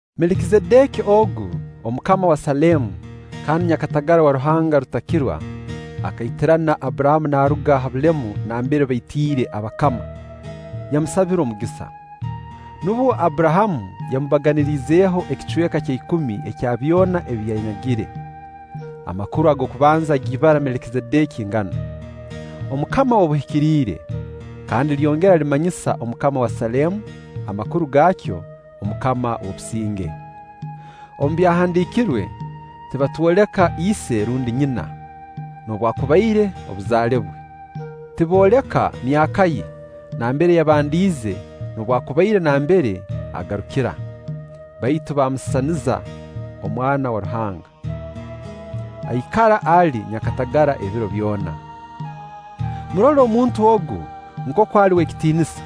Melikizedeki ogu, omukama wa Saleemu kandi nyakatagara wa Ruhanga Rutakirwa, akaitirana Abburahamu naaruga ha bulemu nambere baitiire abakama, yamusabira omugisa. Nubwo Abburahamu yamubaganiriizeeho ekicweka ekya ikumi ekya byona ebi yanyagire. Amakuru g'okubanza ag'ibara Melikizedeki nganu: omukama w'obuhikiriire, kandi lyongera limanyisa omukama wa Saleemu, amakuru gaakyo: omukama w'obusinge. Omu Byahandiikirwe tibatwoleka ise rundi nyina, noobwakubaire obuzaale bwe. Tibooleka myaka ye nambere yabandiize noobwakubaire nambere agarukira; baitu bamusisaniza Omwana wa Ruhanga; aikara ali nyakatagara ebiro byona. Murole omuntu ogu nkooku ali w'ekitiinisa!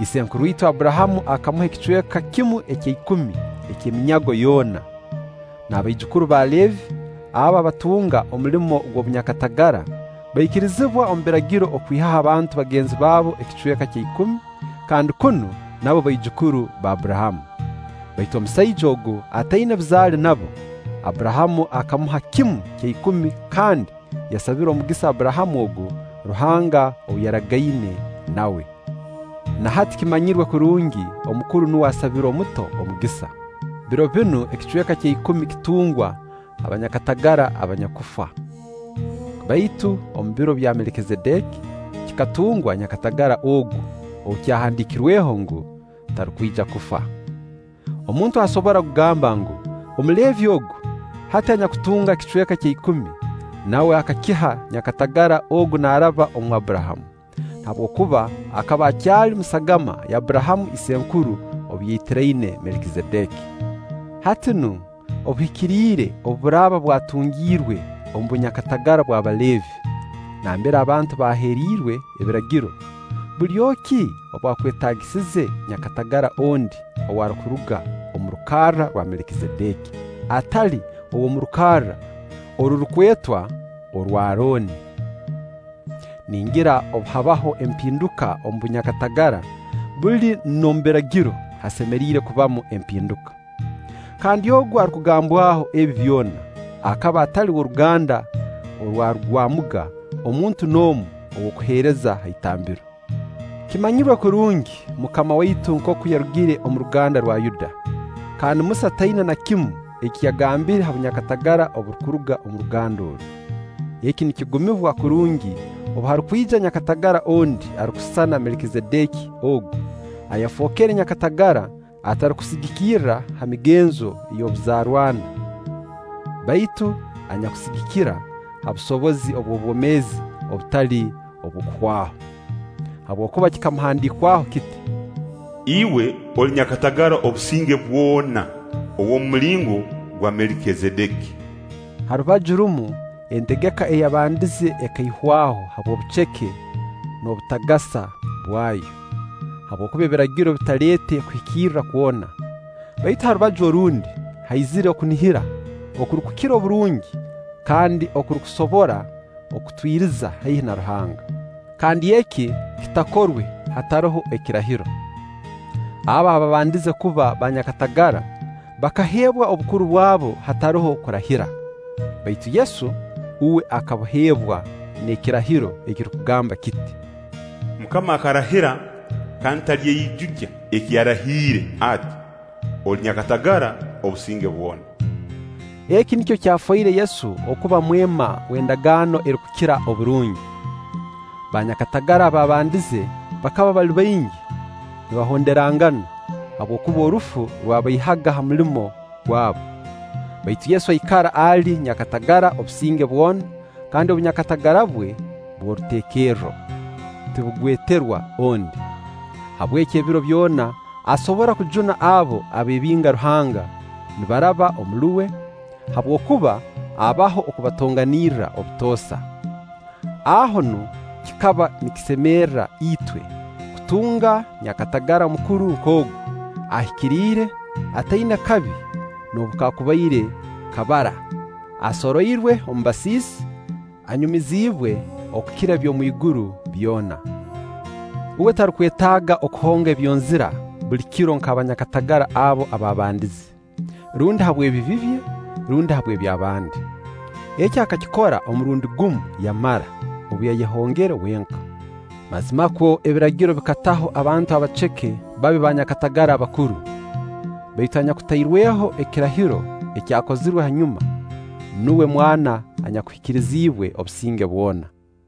Isenkuru itwe Abburahamu akamuha ekicweka kimu ekya ikumi ky'eminyago yoona. N'abaijukuru ba Leevi, abo abatunga omulimo ogw'obunyakatagara, baikirizibwa omu Biragiro okwihaho abantu bagenzi baabo ekicweka kya ikumi, kandi kunu nabo baijukuru ba Abburahamu. Baitu omusaija ogu ataina buzaale nabo, Abburahamu akamuha kimu kya ikumi kandi yasabira omugisa Abburahamu ogu, Ruhanga ou yaragaine nawe. Na hati kimanyirwe kurungi omukuru nuwe asabira omuto omugisa. Biro binu ekicweka ekya ikumi kitungwa banyakatagara abanyakufa, baitu omu biro kya Melikizedeki kikatungwa nyakatagara ogu ou kyahandiikirweho ngu, tarukwija kufa. Omuntu asobora kugamba ngu, Omuleevi ogu, hati anyakutunga ekicweka ekya ikumi, nawe akakiha nyakatagara ogu naaraba omu Abburahamu, habwokuba akaba akyali mu sagama ya Abburahamu isenkuru obu yaitiraine Melikizedeki. Hati nu obuhikiriire obu buraaba bwatungiirwe omu bunyakatagara bw'Abaleevi (nambere abantu baaheeriirwe Ebiragiro), bulyo ki obwakwetaagisize nyakatagara ondi ow'arukuruga omu rukarra rwa Melikizedeki, atali ow'omu rukarra orurukwetwa: “orw'Arooni”? Ningira obu habaho empinduka omu bunyakatagara, buli n'omu Biragiro hasemeriire kubamu empinduka. Kandi ogu arukugambwaho ebi byona, akaba atali w'oruganda orwarugwamuga muntu n'omu ow'okuheereza ha itambiro. Kimanyirwe kurungi MUKAMA waitu nkooku yarugire omu ruganda rwa Yuda, kandi Musa taina na kimu eki yagambire ha bunyakatagara oburukuruga omu ruganda oru. Eki nikigumibwa kurungi obu harukwija nyakatagara ondi arukusisana Melikizedeki ogu ayafookere nyakatagara atarukusigikira ha migenzo y'obuzarranwa, baitu anyakusigikira ha busobozi obw'obwomeezi obutali bw'okuhwaho. Habwokuba kikamuhandiikwaho kiti: “Iwe oli nyakatagara obusinge bwona, ow'omu mulingo gwa Melikizedeki.” Ha rubaju rumu entegeka eyabandize ekaihwaho habw'obuceke n'obutagasa bwayo, (habwokuba Ebiragiro bitaleete kuhikirra kwona); baitu ha rubaju orundi haizire okunihira okurukukira oburungi kandi okurukusobora kutwiriza haihi na Ruhanga. Kandi eki kitakorwe hataroho ekirahiro. Abo abaabandize kuba banyakatagara, bakaheebwa obukuru bwabo hataroho kurahira; baitu Yesu, uwe akabuheebwa n'ekirahiro ekirukugamba kiti: “MUKAMA akarahira kandi talyeijukya eki yarahiire ati: Oli nyakatagara obusinge bwona.” Eki nikyo kyafoire Yesu okuba mwema w'endagaano erukukira oburungi. Baanyakatagara abaabandize bakaba bali baingi nibahonderangana, habwokuba orufu rwabaihaga ha mulimo gwabu. Baitu Yesu aikara ali nyakatagara obusinge bwona kandi obunyakatagara bwe bw'oruteekerro, tibugweterwa ondi. Habweki ebiro byona asobora kujuna abo abeebinga Ruhanga nibaraba omuli uwe, habwokuba abaho okubatonganirra obutoosa. Aho nu kikaba nikisemerra itwe kutunga nyakatagara omukuru nk'ogu, ahikiriire, ataina kabi noobu kakubaire kabara, asoroirwe omu basiisi, anyumiziibwe okukira eby'omu iguru byona. Uwe tarukwetaaga kuhonga ebyonzira buli kiro nk'abanyakatagara abo abaabandize: rundi habw'ebibi bye, rundi habw'eby'abandi. Eki akakikora omurundi gumu yamara, obu yayehongere wenka. Mazimakwo Ebiragiro bikataho abantu abaceke babe banyakatagara abakuru; baitu anyakutairweho ekirahiro ekyahozirwe hanyuma, nuwe Mwana anyakuhikiriziibwe obusinge bwona.